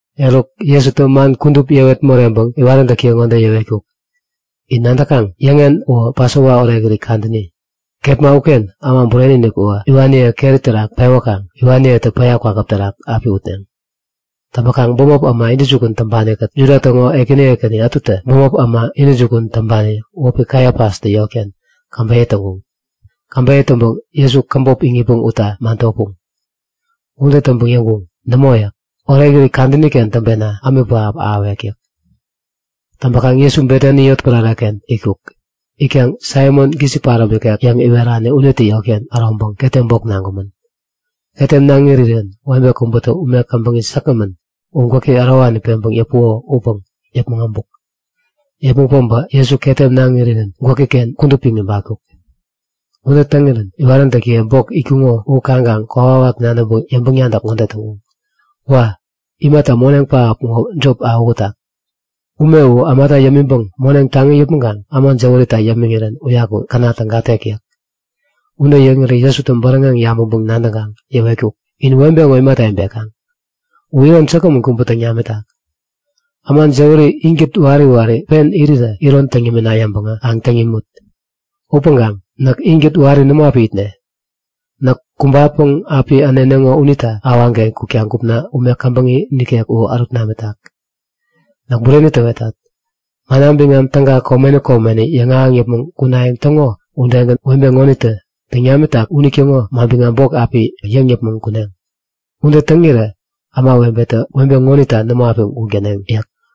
Eruk, Jesutä man kudup yäwet moreŋpäŋ iwaräntäkiye ŋode yäwetkuk; In nadäkaŋ? Yäŋen uwä Pasova Orekirit kadäni. Kepma uken Äma Bureni-inik uwä iwaniye keri terak pewäkaŋ iwaniyetä päya kwakäp terak api utneŋ. Täŋpäkaŋ bämop äma intäjukun täŋpani-kät Juda täŋo ekäni ekäni ätutä bämop äma intäjukun täŋpani wäpi Kaifastä yotken käbeyä täŋkuŋ. Käbeyä täŋpäŋ Jesu käbop iŋitpäŋ utta man topuŋ. Ude täŋpäŋ yäŋkuŋ; Nämo yäk. Orekirit kadäni-ken täŋpena ämik pähap ahäwek yäk. Täŋpäkaŋ Jesu Betani yotpärare-ken itkuk. Itkaŋ Saimon gisik paräm ikek yäŋ iwerani unitä yotken äroŋpäŋ ketem bok naŋkumän. Ketem naŋ irirän webe kubätä ume käbäŋi säkgämän u gwäki ärowani peŋpäŋ yäpuko upäŋ yäpmäŋ abuk. Yäpmäŋ päbä Jesu ketem naŋ irirän gwäki-ken kudup piŋ ibatkuk. Ude täŋirän iwaräntäkiye bok itkuŋo u kaŋkaŋ kokwawak nadäŋpäŋ yäŋpäŋ-nadäk ŋode täŋkuŋ; Wa! Mebäri imata moneŋ pähap ŋo jop awähutak? Ume u ämata yämiŋpäŋ moneŋ taŋi yäpmäŋkaŋ äma jäwärita yämiŋirän uyaku käna tägatek yäk. Ude yäŋirä Jesutä bäräŋeŋ yabäŋpäŋ-nadäŋkaŋ yäwetkuk; In webe ŋo imata ibekaŋ? U iron säkgämän kubä täŋ namitak. Äma jäwäri inkät wari wari pen irirä iron täŋ yämina yäŋpäŋä kaŋ täŋ yämut! Upäŋkaŋ näk inkät wari nämo api itne. Näk kumbapäŋ api äneneŋo unita awaŋken kukta gupna ume käbäŋi nikek u ärut namitak. Näk bureni täwetat. Manna biŋam Täga komeni komeni yäŋahäŋ yäpmäŋ kunayäŋ täŋo udegän webe ŋonitä täŋ namitak unitäŋo manbiŋam bok api yäŋ yäpmäŋ kuneŋ. Ude täŋirä ämawebetä webe ŋonita nämo api guŋ täneŋ yäk.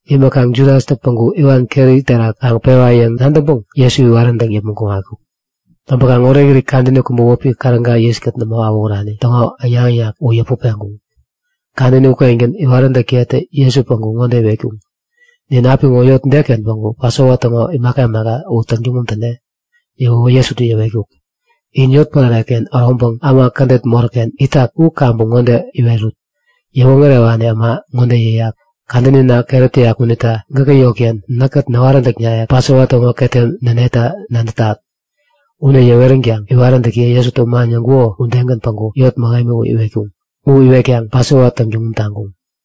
Imäkaŋ Judastä päŋku iwan keri terak kaŋ pewa yäŋ nadäŋpäŋ Jesu iwaräntäŋ yäpmäŋ kuŋatkuk. Täŋpäkaŋ orekirit kadäni kubä wäpi Käräga yiskät nämo awähurani täŋo äŋnak-äŋnak u yäput peŋkuŋ. Kadäni ukengän iwaräntäkiyetä Jesu päŋku ŋode iwetkuŋ; Nin apiŋo yot deken päŋku Pasova täŋo imaka imaka u täŋtuŋum täne? Yäwäwä Jesutä yäwetkuk; In yotpärare-ken äroŋpäŋ äma kädet moräk-ken itak u kaŋpäŋ ŋode iwerut; Yäwoŋärewani äma ŋode yäyak. Kadänina keräp täyak unita gäkä yotken näkkät näwaräntäknaye-kät Pasova täŋo ketem näneta nadätat. Ude yäweränkaŋ iwaräntäkiye Jesutä man yäŋkuko udegän päŋku yot mähemi u iwetkaŋ Pasova täŋtuŋum täŋkuŋ.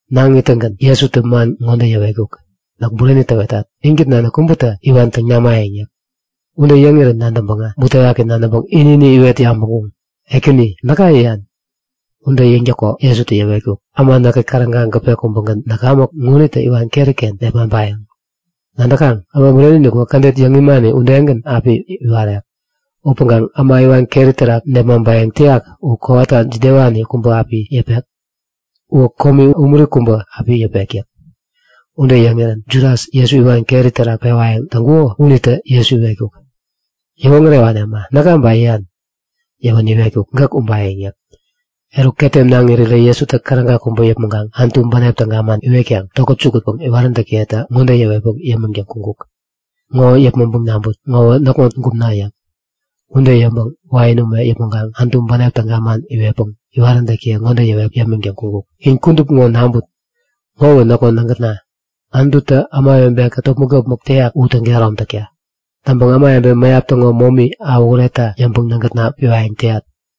Naŋ ittäŋgän Jesutä man ŋode yäwetkuk; Näk bureni täwetat. Inkät nanik kubätä iwan täŋ namayäŋ yäk. Ude yäŋirän nadäŋpäŋä butewaki nadäŋpäŋ ini-ini iwet yabäŋkuŋ; Ekäni, näka yäyan? Ude yäŋtäko Jesutä yäwetkuk; Äma näkkät käräga gäpe kubägän näkamäk ŋonitä iwan keri-ken nepmaŋpayäŋ. Nadäkaŋ? Äma Bureni-inik uwä kädet yäŋ imani udegän api iwarek. Upäŋkaŋ äma iwan keri terak nepmaŋpayäŋ täyak u kowata jidewani kubä api yäpek? Uwä komi umuri kubä api yäpek yäk. Ude yäŋirän Judas, Jesu iwan keri terak pewayäŋ täŋkuko unitä Jesu iwetkuk; Yäwoŋärewani äma, näka ba yäyan? Yäwänä iwetkuk; Gäk ubayäŋ yäk. Eruk ketem naŋ irirä Jesutä käräga kubä yäpmäŋkaŋ Anutu bänep täga man iwetkaŋ tokät jukutpäŋ iwaräntäkiyeta ŋode yäwetpäŋ yämiŋtäŋ kuŋkuk; Ŋo yäpmäŋpäŋ naŋput. Ŋowä näkŋo gupna yäk. Ude yäŋpäŋ wain ume yäpmäŋkaŋ Anutu bänep täga man iwetpäŋ iwaräntäkiye ŋode yäwetpäŋ yämiŋtäŋ kuŋkuk; In kudup ŋo naŋput. Ŋowä näkŋo nägätna, Anututä ämawebe-kät topmäk-topmäk täyak u täŋkehärom takta. Täŋpäŋ ämawebe mäyap täŋo momi awähuretta yäŋpäŋ nägätna piwayäŋ täyat.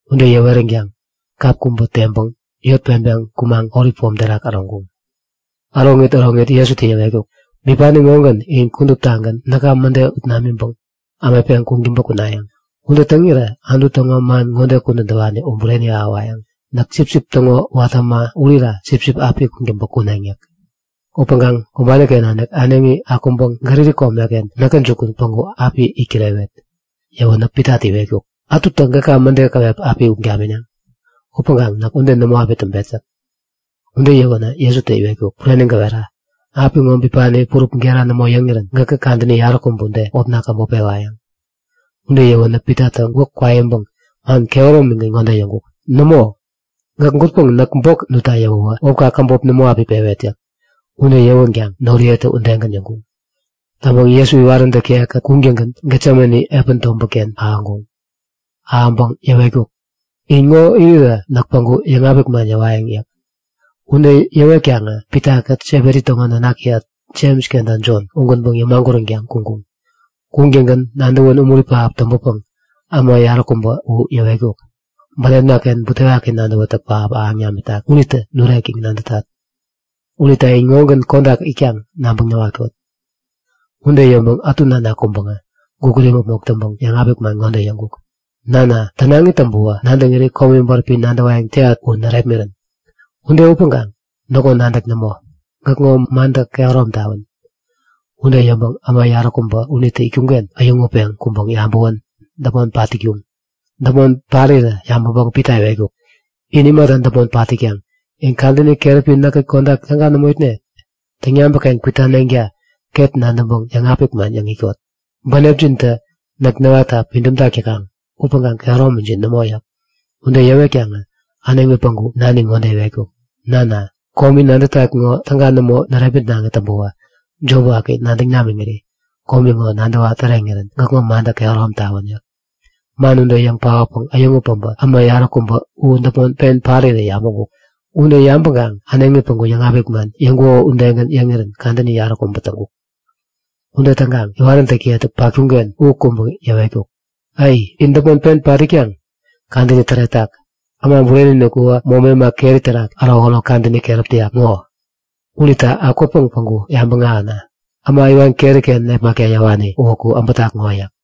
Ude yäweränkaŋ kap kubä teŋpäŋ yot peŋpeŋ kumaŋ Olip Pom terak äroŋkuŋ. Äroŋit äroŋit Jesutä yäwetkuk; Bipani ŋogän in kuduptagän näka mäde ut namiŋpäŋ ämetpeŋ kuŋtäŋpä kunayäŋ. Ude täŋirä Anutu täŋo man ŋode kudän täwani u bureni ahäwayäŋ; Näk sipsip täŋo watä äma urira sipsip api kuŋtäŋpä kuneŋ yäk. Upäŋkaŋ kumbani-ken nanik äneŋi akuŋpäŋ Galili komeken näkä jukun päŋku api it kirewet. Yäwänä Pitatä iwetkuk; Ätutä gäka mäde käwep api ut gamineŋ, upäŋkaŋ näk ude nämo api täŋpet yäk. Ude yäwänä Jesutä iwetkuk; Bureni gäwera. Apiŋo bipani purup gera nämo yäŋirän gäkä kadäni yaräkubä ude wäpna käbop pewayäŋ. Ude yäwänä Pitatä gwäk kwaiŋpäŋ man kehäromigän ŋode yäŋkuk; Nämo! Gäk gutpäŋ näk bok nutta yäwäwä wäpka käbop nämo api pewet yäk. Ude yäwänkaŋ noriyetä udegän yäŋkuŋ. Täŋpäŋ Jesu iwaräntäkiye-kät kuŋtäŋgän Getsemane epän tobätken ahäŋpäŋ yäwetkuk; In ŋode irirä näk päŋku yäŋapik man yäwayäŋ yäk. Ude yäwetkaŋä Pitakät Sebedi täŋo nanakiyat Jems kenta Jon, ugänpäŋ yämaguränkaŋ kuŋkuŋ. Kuŋtäŋgän nadäwän umuri pähap täŋpänpäŋ äma yaräkubä u yäwetkuk; Bänepna-ken butewaki nadäwätäk pähap ahäŋ namitak unitä nurek yäŋ nadätat. Unita in ŋogän kodak itkaŋ nabäŋ näwatkot. Ude yäŋpäŋ ätu nanak kuŋpäŋä gukut imäpmok täŋpäŋ yäŋapik man ŋode yäŋkuk; Nana, tänaŋi täŋpäwä nadäŋiri komi bäräpi nadäwayäŋ täyat u närepmirän. Ude upäŋkaŋ näkŋo nadäk nämo, gäkŋo mantä kehärom tawän. Ude yäŋpäŋ äma yaräkubä unitä itkuŋ-ken äyäŋutpeŋ kuŋpäŋ yabäwän däpmon pat itkuŋ. Däpmon parirä yabäŋpäŋ Pita iwetkuk; In imata däpmon pat itkaŋ? In kadäni keräpi näkkät kodak täga nämo itneŋ? Täŋyabäk-ken kwitaneŋta ket nadäŋpäŋ yäŋapik man yäŋ itkot. Bänepjintä näk näwatta pidäm täkaŋ upäŋkaŋ kehäromijin nämo yäk. Ude yäwetkaŋä äneŋi päŋku nani ŋode iwetkuk; Nana, komi nadätat ŋo täga nämo närepmitnaŋi täŋpäwä jop waki nadäŋ namiŋiri komi ŋo nadäwa täreŋirän gäkŋo mantä kehärom tawän yäk. Man ude yäŋ paotpäŋ äyäŋut päbä äma yaräkubä u däpmon pen parirä yabäŋkuk. Ude yabäŋkaŋ äneŋi päŋku yäŋapik man yäŋkuko udegän yäŋirän kadäni yaräkubä täŋkuk. Ude täŋkaŋ iwaräntäkiyetä patkuŋ-ken u kuŋpäŋ yäwetkuk; Ai! In däpmon pen pat itkaŋ? Kadäni täretak! Äma Bureni-inik uwä momi äma keri terak ärokärok kadäni keräp täyak ŋo. Unita akwäpäŋ päŋku yabäŋ ahäna! Äma iwan keri-ken nepmakta yäwani uwäku äbätak ŋo yäk.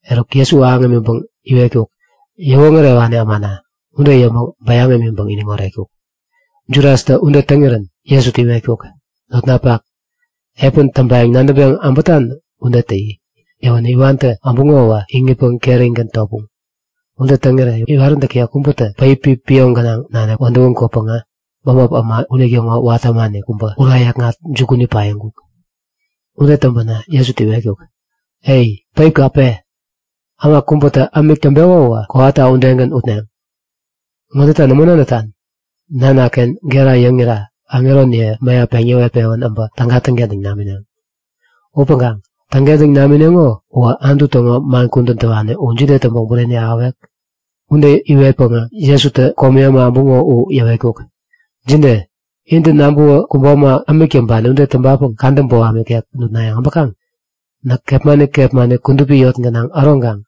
Eruk Jesu ahäŋ imiŋpäŋ iwetkuk; Yäwoŋärewani ämana! Ude yäŋpäŋ bayäŋ imiŋpäŋ iniŋ oretkuk. Judastä ude täŋirän Jesutä iwetkuk; Notnapak, epän täŋpayäŋ nadäŋpeŋ äbätan ude täyi! Yäwänä iwantä äbuŋowä iŋitpäŋ kerigän topuŋ. Ude täŋirä iwaräntäki kubätä päipi pioŋ gänaŋ nanik wädäwän kwäpäŋä bämop äma unitäŋo watä ämani kubä ura yäkŋat jukuni paiŋkuk. Ude täŋpänä Jesutä iwetkuk; Ai! Päipka pe! Äma kubätä ämik täŋpeko uwä kowata udegän utneŋ. Ŋodeta nämo nadätan? Nanaken gera yäŋira aŋeroniye mäyap peŋ yäwet-pewän äbä täga täŋkentäŋ namineŋ. Upäŋkaŋ täŋkentäŋ namineŋo uwä Anutu täŋo man kudän täwani u jide täŋpäŋ bureni ahäwek? Ude iwetpäŋä Jesutä komi äma äbuŋo u yäwetkuk; Jide? Intä nabäwä kubo äma ämik täŋpani ude täŋpapäŋ kadä boham ikek nutnayäŋ äbäkaŋ? Näk kepmani kepmani kudupi yot gänaŋ äroŋkaŋ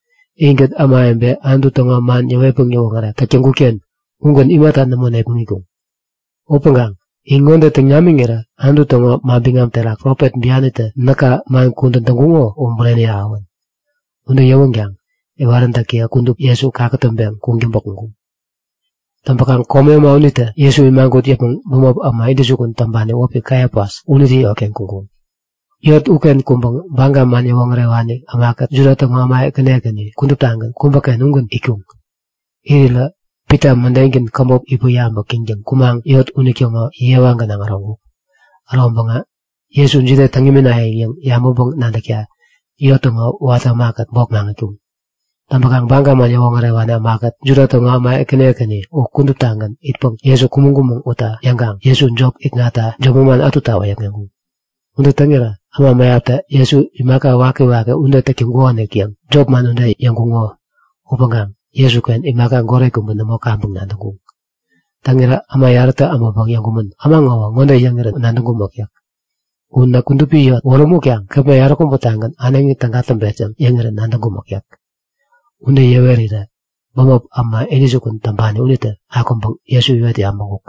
inkät ämawebe Anutu täŋo man yäwetpäŋ yäwoŋärek täk täŋkut-ken ugän imata nämo nepmäŋitkuŋ? Upäŋkaŋ in ŋode täŋ namiŋirä Anutu täŋo manbiŋam terak profet bianitä näka man kudän täŋkuŋo u bureni ahäwän! Ude yäwänkaŋ iwaräntäkiye kudup Jesu kakätäŋpeŋ kuŋtäŋpä kuŋkuŋ. Täŋpäkaŋ komi äma unitä Jesu imagut yäpmäŋ bämop äma intäjukun täŋpani wäpi Kaifas unitä yotken kuŋkuŋ. Yot uken kuŋpäŋ Baga man yäwoŋärewani ämakät Juda täŋo äma ekäni ekäni kuduptagän kubäken ugän itkuŋ. Irirä Pita mädengän käbop itpäŋ-yabäk täŋtäŋ kumaŋ yot unitäŋo yewa gänaŋ äroŋkuk. Äroŋpäŋä Jesu jide täŋ iminayäŋ yäŋ yabäŋpäŋ-nadäkta yot täŋo watä ämakät bok maŋitkuŋ. Täŋpäkaŋ Baga man yäwoŋärewani ämakät Juda täŋo äma ekäni ekäni u kuduptagän itpäŋ Jesu kumäŋ-kumäŋ utna yäŋkaŋ Jesu jop ikŋatta jop manman ätuta wäyäkŋeŋkuŋ. Ude täŋirä äma mäyaptä Jesu imaka wakiwaki ude täk täŋkukonik yäŋ jopman ude yäŋkuŋo upäŋkaŋ Jesuken imaka goret kubä nämo kaŋpäŋ nadäŋkuŋ. Täŋirä äma yarätä äbäŋpäŋ yäŋkumän; Äma ŋowä ŋode yäŋirän nadäŋkumäk yäk. U näk kudupi yot wärämutkaŋ kepma yaräkubä-tagän äneŋi täga täŋpet yäŋ yäŋirän nadäŋkumäk yäk. Ude yäwerirä bämop äma intäjukun täŋpani unitä akuŋpäŋ Jesu iwet yabäŋkuk;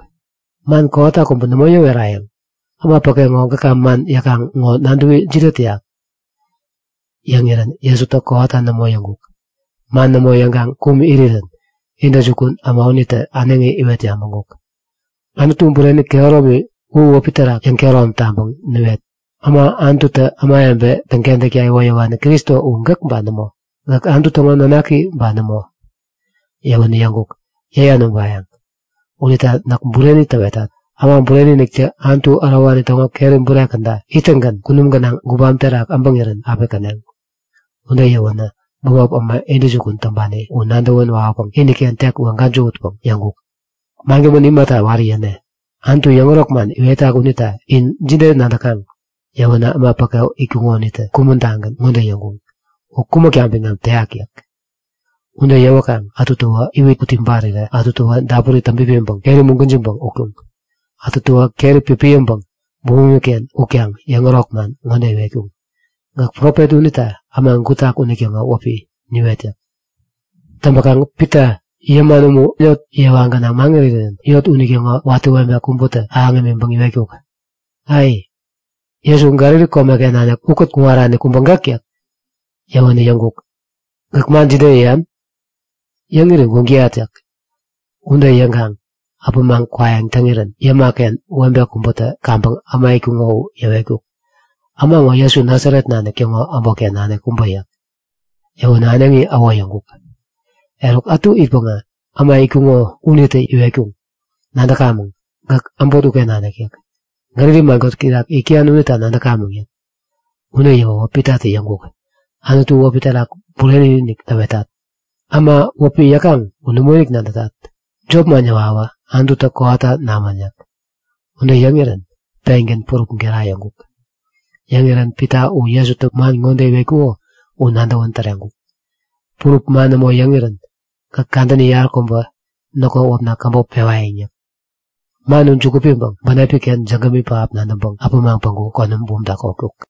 Man kowata kubä nämo yäwerayäŋ? Äma päke ŋo gäka man yäkaŋ ŋo nadäwi jide täyak? Yäŋirän Jesutä kowata nämo yäŋkuk. Man nämo yäŋkaŋ kum irirän intäjukun äma unitä äneŋi iwet yabäŋkuk; Anutu Bureni kehäromi u wäpi terak yäŋkehärom taŋpäŋ niwet! Äma Anututä ämawebeniye täŋkentäkta iwoyäwani Kristo u gäk ba nämo? Gäk Anutu täŋo Nanaki ba nämo? Yäwänä yäŋkuk; Yäyan ubayäŋ. Unita näk bureni täwetat; Äma Bureni-iniktä Anutu ärowani täŋo keri bure käda ittäŋgän kunum gänaŋ gubam terak äbäŋirän api käneŋ. Ude yäwänä bämop äma intäjukun täŋpani u nadäwän wawäpäŋ iniken tek weŋ-gäjähutpäŋ yäŋkuk; Mangämän imata wari yäne? Anutu yäŋärok man iwetak unita in jide nadäkaŋ? Yäwänä äma päke itkuŋo unitä kumän-tagän ŋode yäŋkuŋ; U kumäkta biŋam täyak! yäk. Ude yäwäkaŋ ätutäwä iwit ut ibarirä ätutäwä dapuri täŋpipiŋkaŋ keri mugwäjiŋpäŋ utkuŋ. Ätutäwä keri pipiyäŋpäŋ bumumi-ken utkaŋ yäŋärok man ŋode iwetkuŋ; Gäk profet unita äma gutak unitäŋo wäpi niwet! yäk. Täŋpäkaŋ Pita yäman umu, man yot yewa gänaŋ maŋirirän yot unitäŋo watä webe kubätä ahäŋ imiŋpäŋ iwetkuk; Ai! Jesu Galili komeken nanik ukät kuŋarani kubä gäk yäk. Yäwänä yäŋkuk; Gäk man jide yäyan? Yäŋiri guŋ täyat yäk. Ude yäŋkaŋ äpämaŋ kwayäŋ täŋirän yäma-ken webe kubätä kaŋpäŋ äma itkuŋo u yäwetkuk; Äma ŋo Jesu Nasaret nanik täŋo äbotken nanik kubä yäk. Yäwänä äneŋi äwo yäŋkuk. Eruk ätu itpäŋä äma itkuŋo unitä iwetkuŋ; Nadäkamäŋ! Gäk äbot uken nanik yäk. Galili man kotäk terak yäk täyan unita nadäkamäŋ yäk. Ude yäwäwä Pitatä yäŋkuk; Anutu wäpi terak bureni-inik täwetat! Äma wäpi yäkaŋ u nämoinik nadätat. Jop man yäwawä Anututä kowata namän yäk. Ude yäŋirän pengän purup gera yäŋkuk. Yäŋirän Pita u Jesutä man ŋode iwetkuko u nadäwän täreŋkuk; Purup man nämo yäŋirän gäk kadäni yaräkubä näkŋo wäpna käbop pewayäŋ yäk. Man u juku piŋpäŋ bänepi-ken jägämi pähap nadäŋpäŋ äpämaŋ päŋku konäm bumta kotkuk.